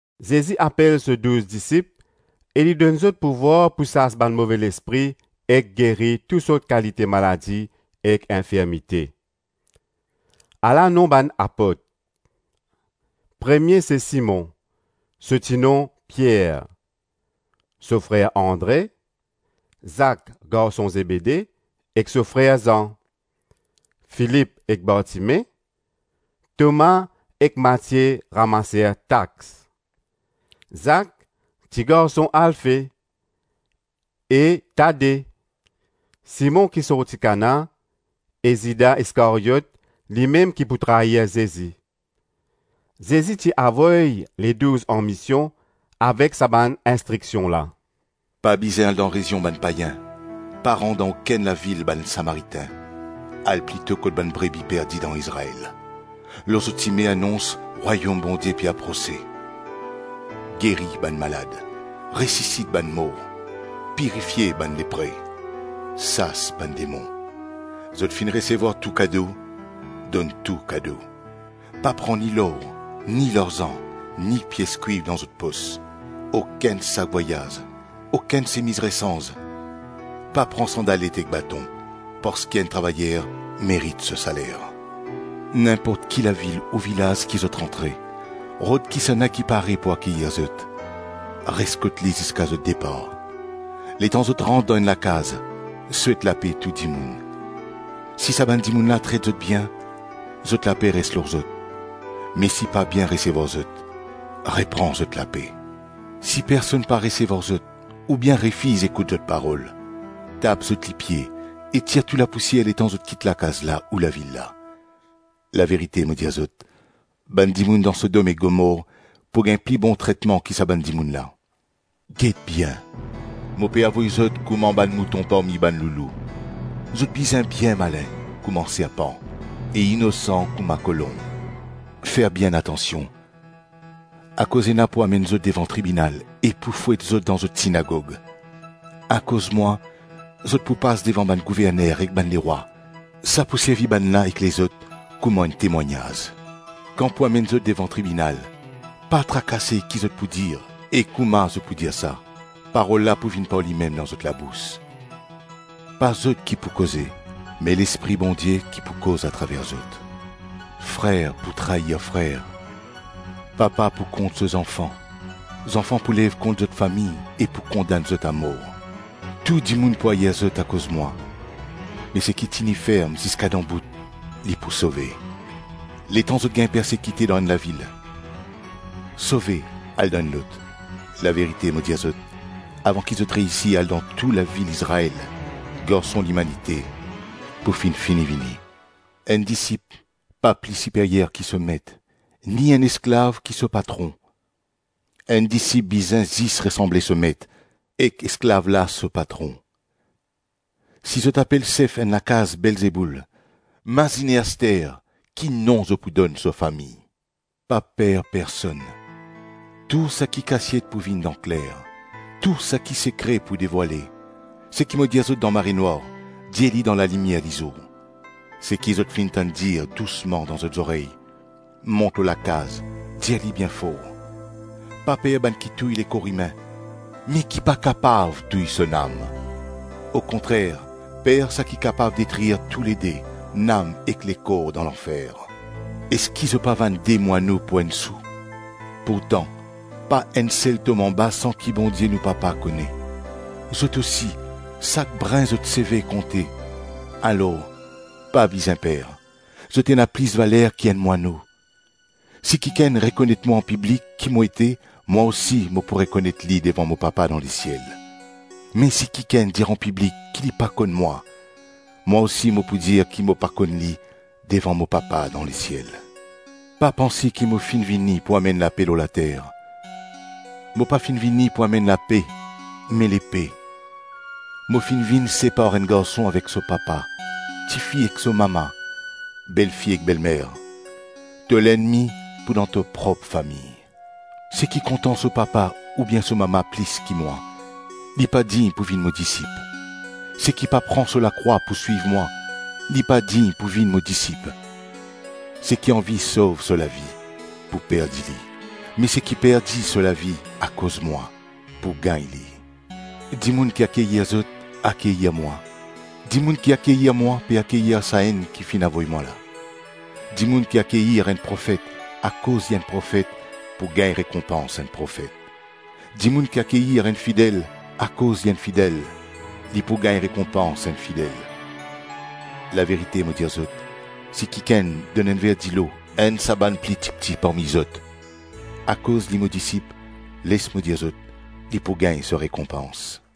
Zezi apel so douz disip e li donn zot pouvwar pou sas bann move lespri ek geri tou sort kalite maladi ek infirmite Ala nom bann apot: premie se Simon, so ti-nom Pier, so frer Andre; Zak garson Zebede, ek so frer Zan; Filip ek Bartime; Toma ek Matie ramaser tax; Zak ti garson Alfe, e Tade, Simon ki sorti Kana, e Zida Iskaryot, limem ki pou trair Zezi. Zezi ti avoy Ledouz anmision avek sa bann instriksion la, “Pa bizin al dan rezion bann payin, pa rant dan okenn lavil bann Samaritin, al plito kot bann brebi perdi dan Izrael. Lor zot sime, anons, ‘Rwayom Bondie pe aprose.’ Geri bann malad, resisit bann mor, pirifie bann lepre, sas bann demon. Zot finn resevwar tou kado, donn tou kado. Pa pran ni lor, ni larzan, ni pies kwiv dan zot pos, okenn sak vwayaz, okenn semiz resanz, pa pran sandalet ek baton, parski enn travayer merit so saler. Ninport ki lavil ou vilaz ki zot rantre, rod kisannla ki pare pou akeyir zot, res kot li ziska zot depar. Letan zot rant dan enn lakaz, souet lape tou dimoun, si sa bann dimoun la tret zot bien, zot lape res lor zot, me si pa bien resevwar zot, repran zot lape. Si personn pa resevwar zot oubien refiz ekout zot parol, tap zot lipie e tir tou lapousier letan zot kit lakaz la ou lavil la. Laverite mo dir zot, bann dimoun dan Sodom ek Gomor pou gagn pli bon tretman ki sa bann dimoun la. Get bien, mo pe avoy zot kouma bann mouton parmi bann loulou; zot bizin bien malin kouma serpan e inosan kouma kolonb. Fer bien atansion, akoz ena pou amenn zot devan tribinal e pou fwet zot dan zot sinagog; akoz mwa, zot pou pas devan bann gouverner ek bann lerwa, sa pou servi bann la ek lezot kouma enn temwagnaz. Kan pou amenn zot devan tribinal, pa trakase ki zot pou dir e kouma zot pou dir sa; parol la pou vinn par limem dan zot labous; pa zot ki pou koze, me Lespri Bondie ki pou koz atraver zot. Frer pou trair frer, papa pou kont so zanfan, zanfan pou lev kont zot fami e pou kondann zot amor. Tou dimoun pou air zot akoz mwa, me seki tini ferm ziska dan bout, li pou sove. Letan zot gagn persekite dan enn lavil, sove al dan enn lot; laverite mo dir zot, avan ki zot reysi al dan tou lavil Izrael Garson Limanite pou finn fini vini. Enn disip, pa pli siperyer ki so met; ni enn esklav ki so patron; Enn disip bizin zis resanble so met ek esklav la so patron. Si zot apel sef enn lakaz Belzeboul, mazine aster ki nom zot pou donn so fami. Pa per personn. Tou saki kasiet pou vinn dan kler, tou saki sekre pou devwale; seki mo dir zot dan marenwar, dir li dan lalimier lizour; seki zot finn tann dir dousman dan zot zorey, mont lor lakaz, dir li bien for. Pa per bann ki touy lekor imin, me ki pa kapav touy so nam; okontrer per saki kapav detrir toulede, nam ek lekor dan lanfer. Eski zot pa vann de mwano pou enn sou? Pourtan, pa enn sel tom anba san ki Bondie nou Papa kone. Zot osi, sak brin zot seve konte. Alor, pa bizin per, zot ena plis valer ki enn mwano.” “Si kikenn rekonet mwa anpiblik ki mo ete, mwa osi mo pou rekonet li devan mo Papa dan lesiel; me si kikenn dir anpiblik ki li pa konn mwa, mwa osi mo pou dir ki mo pa konn li devan mo Papa dan lesiel.” “Pa panse ki mo finn vini pou amenn lape lor later; mo pa finn vini pou amenn lape, me lepe. Mo finn vinn separ enn garson avek so papa, tifi ek so mama, belfi ek belmer. To lennmi pou dan to prop fami. Seki kontan so papa oubien so mama plis ki mwa, li pa dign pou vinn mo disip. Seki pa pran so lakrwa pou swiv mwa, li pa dign pou vinn mo disip. Seki anvi sov so lavi, pou perdi li; me seki perdi so lavi akoz mwa, pou gagn li.” “Dimoun ki akeyir zot, akeyir mwa, dimoun ki akeyir mwa, pe akeyir sa enn ki finn avoy mwa la. Dimoun ki akeyir enn profet akoz li enn profet pou gagn rekonpans enn profet; dimoun ki akeyir enn fidel akoz li enn fidel, li pou gagn rekonpans enn fidel. Laverite mo dir zot, si kikenn donn enn ver dilo enn sa bann pli tipti parmi zot, akoz li mo disip, les mo dir zot, li pou gagn so rekonpans.”